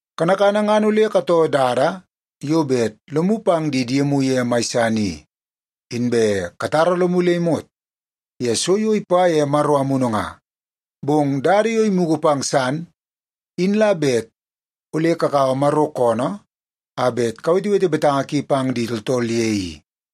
Kanakana ngan ole katoo dada yo bet lomu pang di diemu ye mai san i, inbe katara lomu le imot ye so yo ipa ye Maro Amunu nga. Bong dada yo imugu pang san in la bet ole kakaua Maro koonoo a bet kawetewete betanga ki pang di tooltool ye i.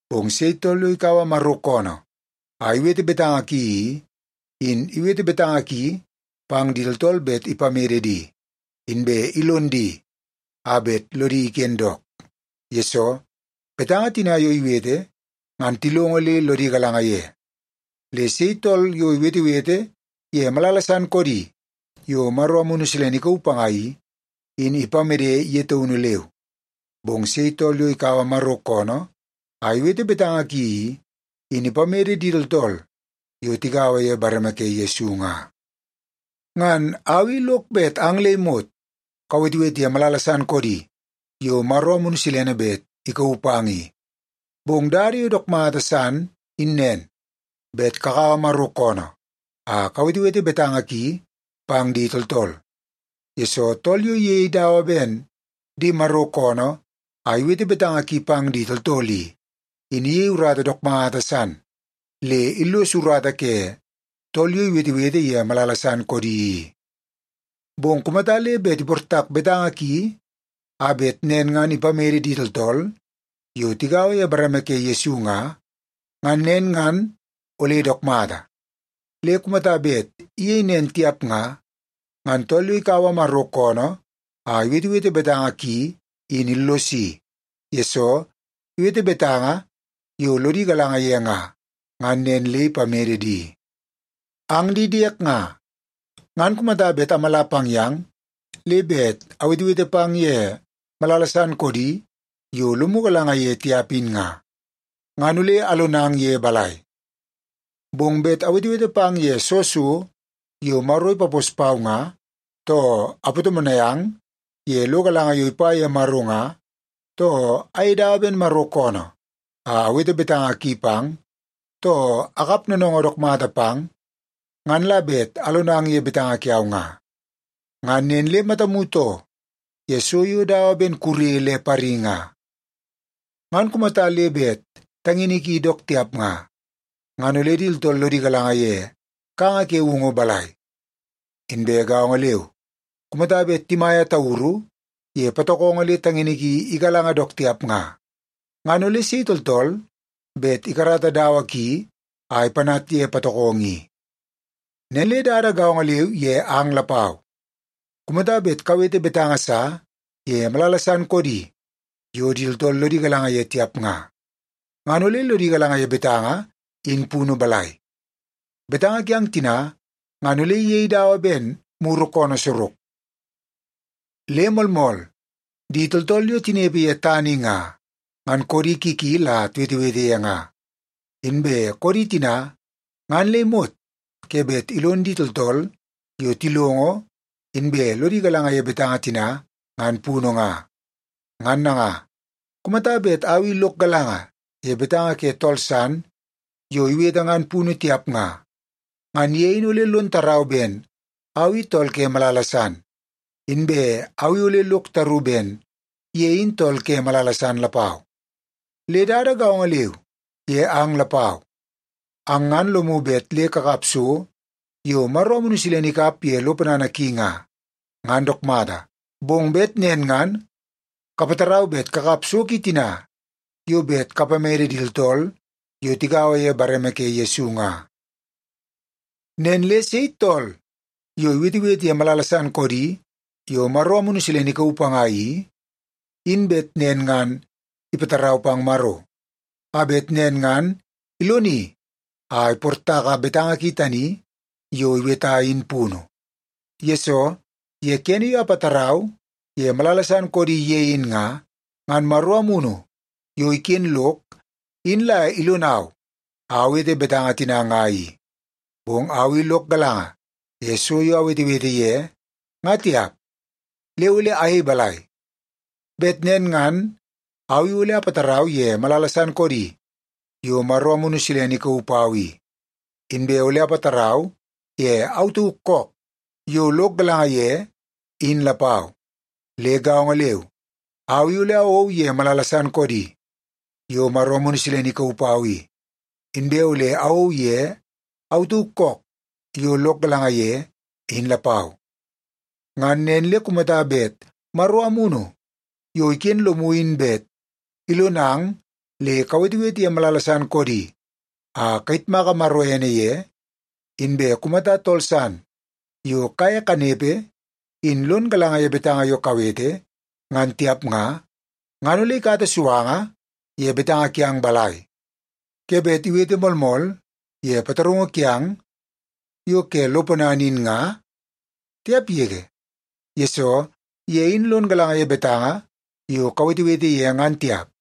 Bong sei tool yo ikaua Maro koonoo a iwete betanga ki i, in iwete betanga ki pang di tooltool bet ipamede di, inbe ilon di a bet lodi iken dook. Yesoo, betanga tina yo iwete ngan tilongo le lodi galanga ye. Le sei tool yo iwetewete ye malala san koodi yo Maro Amunu Silene ikauu panga i, in ipamede ye taunu leu. Bong sei tool yo ikaua Maro koonoo a iwete betanga ki i, in ipamede di tooltool yo tigaua ye bareme ke Yesu nga. Ngan au i lok bet ang le imot kawetewete ye malala san koodi yo Maro Amunu Silene bet ikauu pang i. Bong dada yo dook mata san in nen, bet kakaua Maro koonoo a kawetewete betanga ki pang di tooltool, yesoo tool yo iyei dawa ben di Maro koonoo a iwete betanga ki pang di tooltool i, in iyei urata dook mata san le illos urata ke tool yo iwetewete ye malala san koodi i. Bong kumata le bet iportak betanga ki a bet nen ngan ipamede di tooltool yo tigaua ye bareme ke Yesu nga, ngan nen ngan ole dook mata. Le kumata bet iyei nen tiap nga, ngan tool yo ikaua Maro koonoo a iwetewete betanga ki in illosi, yesoo iwete betanga yo lodi galanga ye nga, ngan nen le ipamede di. Ang di diek nga, ngan kumata bet amala pang yang le bet awetewete pang ye malala san koodi yo lomu galanga ye tiap in nga, ngan ole alonang ye balai? Bong bet awetewete pang ye soo so yo Maro ipapos pau nga, too apatomonai ang ye lo galanga yo ipa ye Maro nga, too ayei dawa ben Maro koonoo a awete betanga ki pang, too akap noonoongoo dook mata pang, ngan la bet alonang ye betanga kiau nga. Ngan nen le matamu too ye so yo dawa ben kure le pari nga, ngan kumata le bet tangini kidi dook tiap nga, ngan ole di tooltool lodi galanga ye kanga ke woungu balai? Inbe gaongo leu, kumata bet timaia tauru ye patokongo le tangini ki igalanga dook tiap nga, ngan ole sei tooltool bet ikarata dawa ki a ipanat ye patokongo i? Nen le dada gaongo leu ye ang lapau. Kumata bet kawete betanga sa ye malala san koodi yo di tooltool lodi galanga ye tiap nga, ngan ole lodi galanga ye betanga in punu balai? Betanga kiang tina ngan ole iyei dawa ben muru koonoo sorok. Le moolmool, di tooltool yo tinepe ye tana i nga, ngan koodi ki ki la tiwetewete ye nga. Inbe koodi tina ngan le imot ke bet ilon di tooltool yo tilongo inbe lodi galanga ye betanga tina ngan punu nga. Ngan nanga, kumata bet au i lok galanga ye betanga ke tool san yo iwete ngan punu tiap nga, ngan ye in ole lon tarau ben au i tool ke malala san, inbe au i ole lok taru ben ye in tool ke malala san lapau. Le dada gaongo leu ye ang lapau. Ang ngan lomu bet le kakap so yo Maro Amunu Silene ikap ye lo ponana ki nga. Ngan dook mata, bong bet nen ngan kapatarau bet kakap so ki tina yo bet kapamede di tooltool yo tigaua ye bareme ke Yesu ye nga. Nen le sei tool yo iwetewete ye malala san koodi yo Maro Amunu Silene ikauu panga i, in bet nen ngan ipatarau pang Maro, a bet nen ngan iloni a iportaka betanga ki tani yo iweta in punu. Yesoo, ye kene yo apatarau ye malala san koodi ye in nga, ngan Maro Amunu yo iken lok in la ilonau a awete betanga tina nga i. Bong au i lok galanga ye so yo awetewete ye, nga tiap. Le ole ayei balai? Bet nen ngan au i ole apatarau ye malala san koodi yo Maro Amunu Silene ikauu pau i, inbe ole apatarau ye au tauk kook yo lok galanga ye, in lapau. Le gaongo leu, au i ole awou ye malala san koodi yo Maro Amunu Silene ikauu pau i, inbe ole awou ye au tauk kook yo lok galanga ye, in lapau. Ngan nen le kumata bet Maro Amunu yo iken lomu in bet ilonang le kawetewete ye malala san koodi a kayitmaka Maro ene ye, inbe kumata tool san yo kaye kanepe in lon galanga ye betanga yo kawete ngan tiap nga, ngan ole ikata suanga ye betanga kiang balai? Ke bet iwete “Moolmool” ye pataraungu kiang yo ke lo ponana in nga? Tiap yege, yesoo ye in lon galanga ye betanga yo kawetewete ye ngan tiap.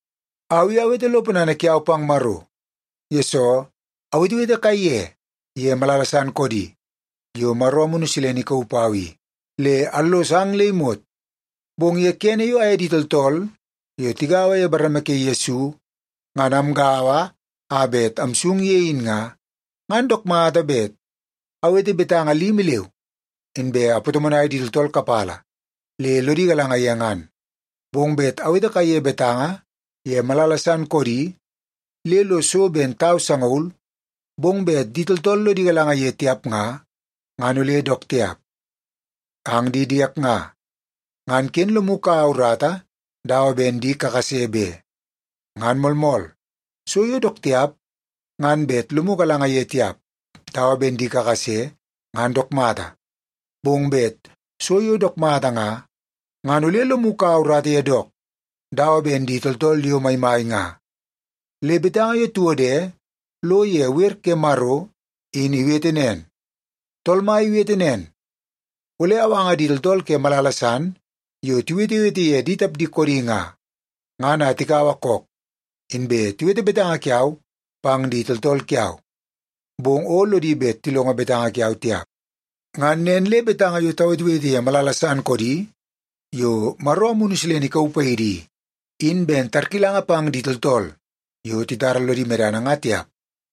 Au i awete lo ponana kiau pang Maro, yesoo awetewete kaiye ye malala san koodi yo Maro Amunu Silene ikauu pau i, le allos ang le imot. Bong ye kene yo aye di tooltool yo tigaua ye bareme ke Yesu, ngan amgaua a bet amsung ye in nga, ngan dook mata bet awete betanga limi leu, inbe apatomonai di tooltool kapala le lodi galanga ye ngan. Bong bet awete kaiye betanga ye malala san koodi le lo so ben tau sangaul, bong bet di tooltool lodi galanga ye tiap nga, ngan ole dook tiap. Ang di diek nga, ngan ken lomu kaua urata dawa ben di kakase be. Ngan moolmool, so yo dook tiap ngan bet lomu galanga ye tiap dawa ben di kakase ngan dook mata. Bong bet so yo dook mata nga, ngan ole lomu kaua urata ye dook dawa ben di tooltool yo maimai nga. Le betanga yo tiwode lo ye wer ke Maro in iwete nen, “Tool Mai iwete nen, ‘Ole awanga di tooltool ke malala san yo tiwetewete ye di tapdi koodi nga, ngan a tikaua kook, inbe tiwete betanga kiau pang di tooltool kiau. Bong o lodi bet tilongo betanga kiau tiap.’” Ngan nen le betanga yo tawetewete ye malala san koodi yo Maro Amunu Silene ikauu paidi i, in ben tarkilanga pang di tooltool yo titara lodi medana nga tiap,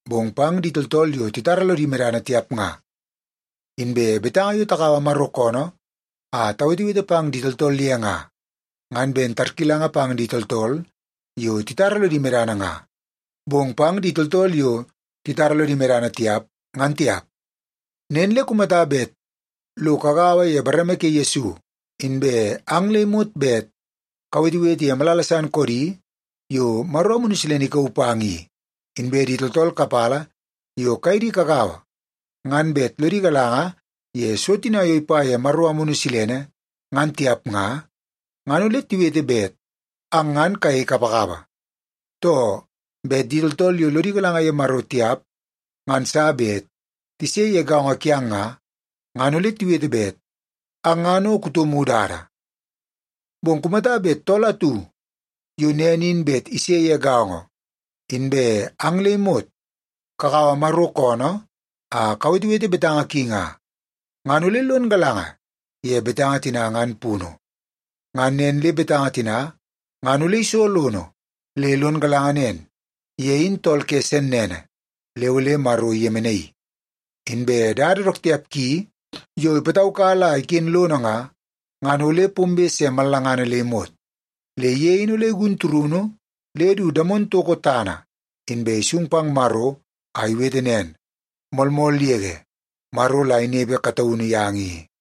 bong pang di tooltool yo titara lodi medana tiap nga. Inbe betanga yo takaua Maro koonoo a tawetewete pang di tooltool ye nga, ngan ben tarkilanga pang di tooltool yo titara lodi medana nga, bong pang di tooltool yo titara lodi medana tiap, ngan tiap. Nen le kumata bet lo kagaua ye bareme ke Yesu, inbe ang le imot bet kawetewete ye malala san koodi yo Maro Amunu Silene ikauu pang i, inbe di tooltool kapala yo kaye di kagaua ngan bet lodi galanga ye so tina yo ipa ye Maro Amunu Silene ngan tiap nga, ngan ole tiwete bet ang ngan kayei kapakapa. Too, bet di tooltool yo lodi galanga ye Maro tiap ngan sa bet tise ye gaongo kiang nga, ngan ole tiwete bet ang ngan o kutomu dada. Bong kumata bet tool atu yo nen in bet ise ye gaongo, inbe ang le imot kakaua Maro koonoo a kawetewete betanga ki nga, ngan ole lon galanga ye betanga tina ngan punu. Ngan nen le betanga tina ngan ole iso lono le lon galanga nen, ye in tool ke sennene le ole Maro iyemenaii. Inbe dada dook tiap ki yo ipataukala a iken lono nga, ngan ole pombe se mallangana le imot. Le ye in ole igun turunu le du damono toko tana, inbe isung pang Maro a iwete nen, “Moolmool yege, Maro la inepe kataunu yang i.”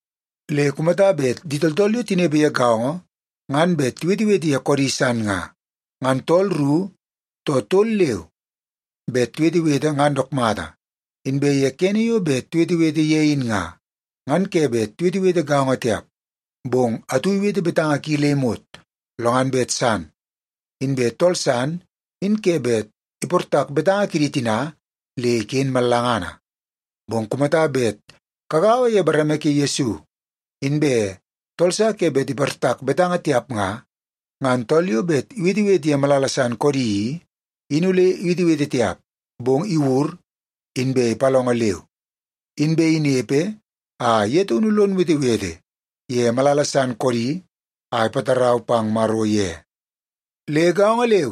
Le kumata bet di tooltool yo tinepe ye gaongo ngan bet tiwetewete ye koodi san nga, ngan tooltool ru too tol leu bet tiwetewete ngan dook mata. Inbe ye kene yo bet tiwetewete ye in nga, ngan ke bet tiwetewete gaongo tiap. Bong atu iwete betanga ki le imot, lo ngan bet san. Inbe tool san in ke bet iportak betanga kidi tina le iken mallangana. Bong kumata bet kagaua ye bareme ke Yesu, inbe tool sa ke bet iportak betanga tiap nga, ngan tool yo bet iwetewete ye malala san koodi i, in ole iwetewete tiap, bong iwur, inbe ipalongo leu. Inbe inepe a ye taunu lon wetewete ye malala san koodi a ipatarau pang Maro ye. Le gaongo leu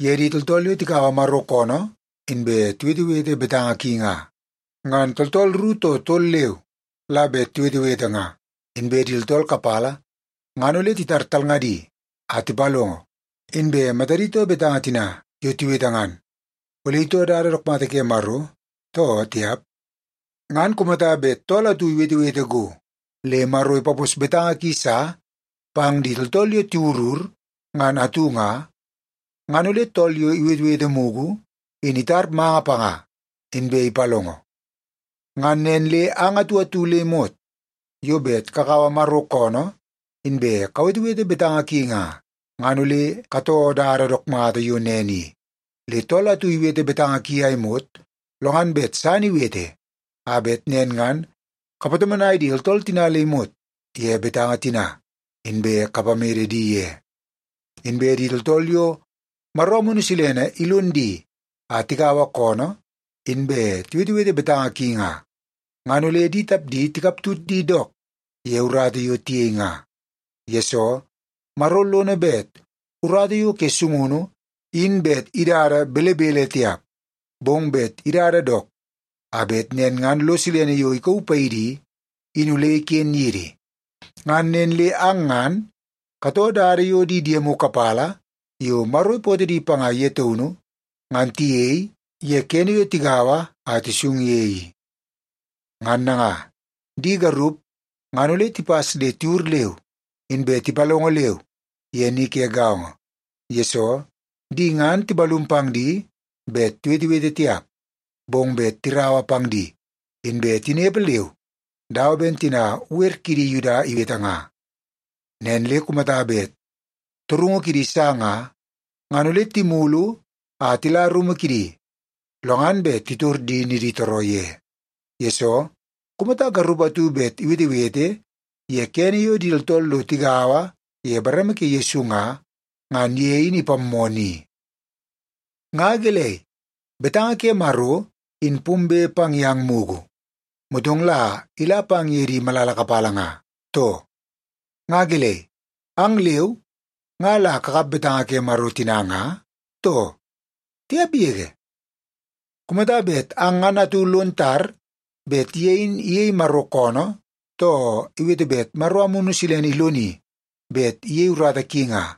ye di tooltool yo tikaua Maro koonoo inbe tiwetewete betanga ki nga. Ngan tooltool ru too tol leu la bet tiwetewete nga, inbe di tooltool kapala ngan ole titar talngadi a tipalongo, inbe matadi too betanga tina yo tiwete ngan, ole itoo dada dook mata ke Maro, too tiap. Ngan kumata bet tool atu iwetewete go le Maro ipapos betanga ki sa pang di tooltool yo tiwurur ngan atu nga, ngan ole tool yo iwetewete mugu in itar manga panga, inbe ipalongo. Ngan nen le ang atu atu le imot yo bet kakaua Maro koonoo inbe kawetewete betanga ki nga, ngan ole katoo dada dook mata yo nen i. Le tool atu iwete betanga ki a imot, lo ngan bet san iwete, a bet nen ngan kapatomonai di tooltool tina le imot ye betanga tina, inbe kapamede di ye. Inbe di tooltool yo Maro Amunu Silene ilon di a tikaua koonoo, inbe tiwetewete betanga ki nga, ngan ole di tapdi tikaptut di dook ye urata yo tiyei nga. Yesoo, Maro lono bet urata yo ke sungunu in bet idada belebele tiap, bong bet idada dook a bet nen ngan lo silene yo ikauu paidi i, in ole iken yidi. Ngan nen le ang ngan katoo dada yo di diemu kapala yo Maro ipootoo di panga ye taunu ngan tiyei ye kene yo tigaua a tisung ye i. Ngan nanga, di garup ngan ole tipas le tiwur, inbe tipalongo leu ye ni ke gaongo. Yesoo, di ngan timalum pang di bet tiwetewete tiap, bong bet tiraua pang di, inbe tinepe leu dawa ben tina wer kidi Yuda iwete nga. Nen le kumata bet torungu kidi sa nga, ngan ole timulu a tila rumu kidi, lo ngan bet titor di niditooroo ye. Yesoo, kumata garup atu bet iwetewete ye kene yo di tooltool lo tigaua ye bareme ke Yesu nga, ngan ye in ipammoo ni. Nga gelei, betanga ke Maro in pombe pang yang mugu, motong la ila pang ye di malala kapala nga, too? Nga gelei, ang leu nga la kakap betanga ke Maro tina nga, too? Tiap yege! Kumata bet ang ngan atu lon tar bet ye in iyei Maro koonoo, too iwete bet Maro Amunu Silene iloni bet iyei urata ki nga,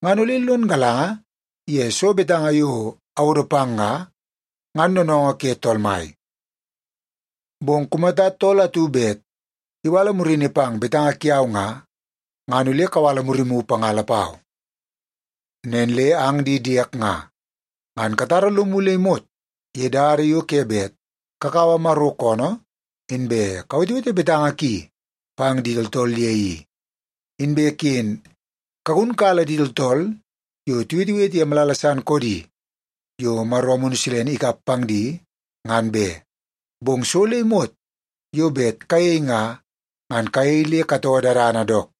ngan ole lon galanga ye soo betanga yo awodo pang nga, ngan noonoongoo ke Tool Mai. Bong kumata tool atu bet iwala murini pang betanga kiau nga, ngan ole kawala murimu panga lapau. Nen le ang di diek nga, ngan katara lomu le imot ye dada yo ke bet kakaua Maro koonoo, inbe kawetewete betanga ki pang di tooltool ye i. Inbe ken kagunkala di tooltool yo tiwetewete ye malala san koodi yo Maro Amunu Silene ikap pang di ngan be. Bong so le imot yo bet kayei nga, ngan kayei le katoo dadana dook.